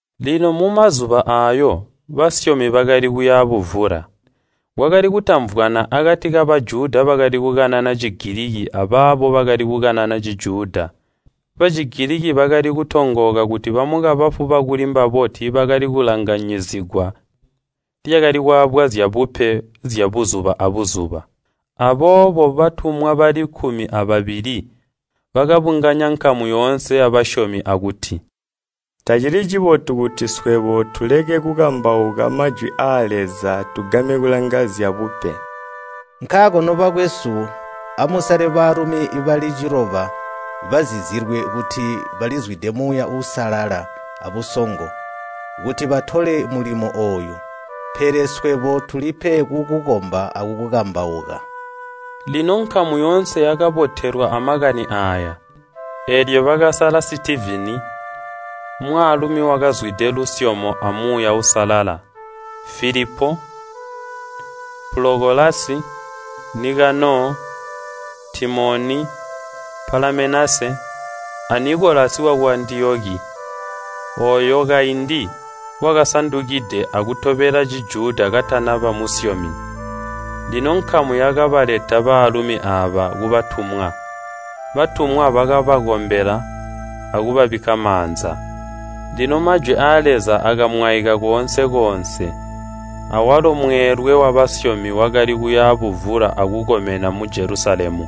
Lino mumazuba aayo, basyomi bakali kuya buvula. Kwakali kutamvwana akati ka Bajuda bakali kukanana Cigiliki abaabo bakali kukanana Cijuda. Bacigiliki bakali kutongooka kuti bamukabafu bakuli mbabo tiibakali kulanganyizigwa lyakali kwaabwa zyabupe zya buzuba abuzuba Aboobo batumwa bali kkumi ababili bakabunganya nkamu yoonse yabasyomi akuti, “Tacili cibotu kuti swebo tuleke kukambauka Majwi aa Leza tugame kulanga zyabupe. Nkaako nobakwesu, amusale baalumi bali ciloba bazizilwe kuti balizwide Muuya Uusalala abusongo, kuti batole mulimo ooyu. Pele swebo tulipe kukukomba akukambauka.” Lino nkamu yoonse yakabotelwa amakani aaya, eelyo bakasala Sitivini, mwaalumi wakazwide lusyomo a Muuya Uusalala, Filipo, Pulokolasi, Nikanoo, Timoni, Palamenasi, a Nikolasi waku Antiyoki, ooyo kaindi wakasandukide akutobela Cijuda katanaba musyomi. Lino nkamu yakabaleta baalumi aaba kubatumwa. Batumwa bakabakombela akubabikka maanza. Lino Majwi aa Leza akamwaika koonse-koonse, awalo mweelwe wabasyomi wakali kuya buvula akukomena mu Jelusalemu.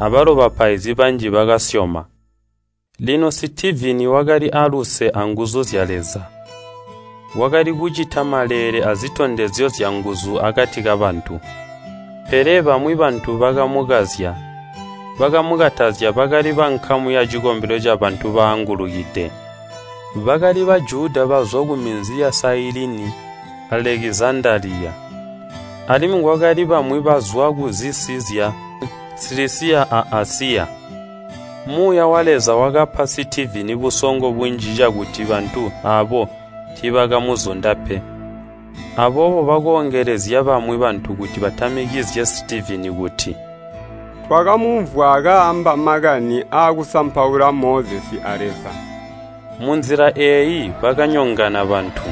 Abalo bapaizi banji bakasyoma. Lino Sitivini wakali aluse anguzu zya Leza. Wakali kucita maleele azitondezyo zyanguzu akati kabantu. Pele bamwi bantu bakamukazya, bakamukatazya bakali bankamu yacikombelo ca Bantu Baangulukide (mbocakali kwiitwa). Bakali Bajuda bazwa kuminzi ya Sailini a Alekizandaliya, alimwi kwakali bamwi bazwa kuzisi zya Silisiya a Asiya. Muuya wa Leza wakapa Sitivini busongo bunji cakuti bantu aabo tiibakamuzunda pe. Aboobo bakoongelezya bamwi bantu kuti batamikizye Sitivini kuti, “Twakamumvwa kaamba makani aakusampaula Mozesi a Leza!” Munzila eeyi bakanyonganya bantu,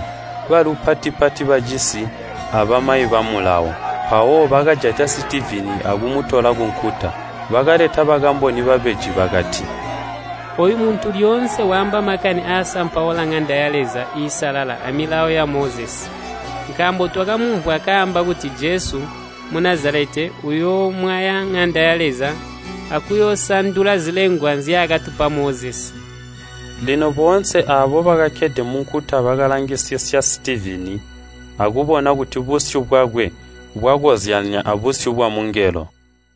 balupati-pati bacisi, abamayi ba Mulawo. Mpawo bakajata Sitivini akumutola kunkuta. Bakaleta bakamboni babeji bakati, “Ooyu muntu lyoonse waamba makani aasampaula ŋanda ya Leza iisalala a Milawo ya Mozesi. Nkaambo twakamumvwa kaamba kuti Jesu Munazaleta uyoomwaya ŋanda ya Leza akuyoosandula zilengwa nzyaakatupa Mozesi!” Lino boonse aabo bakakkede munkuta bakalangisisya Sitivini akubona kuti busyu bwakwe bwakozyanya abusyu bwamungelo.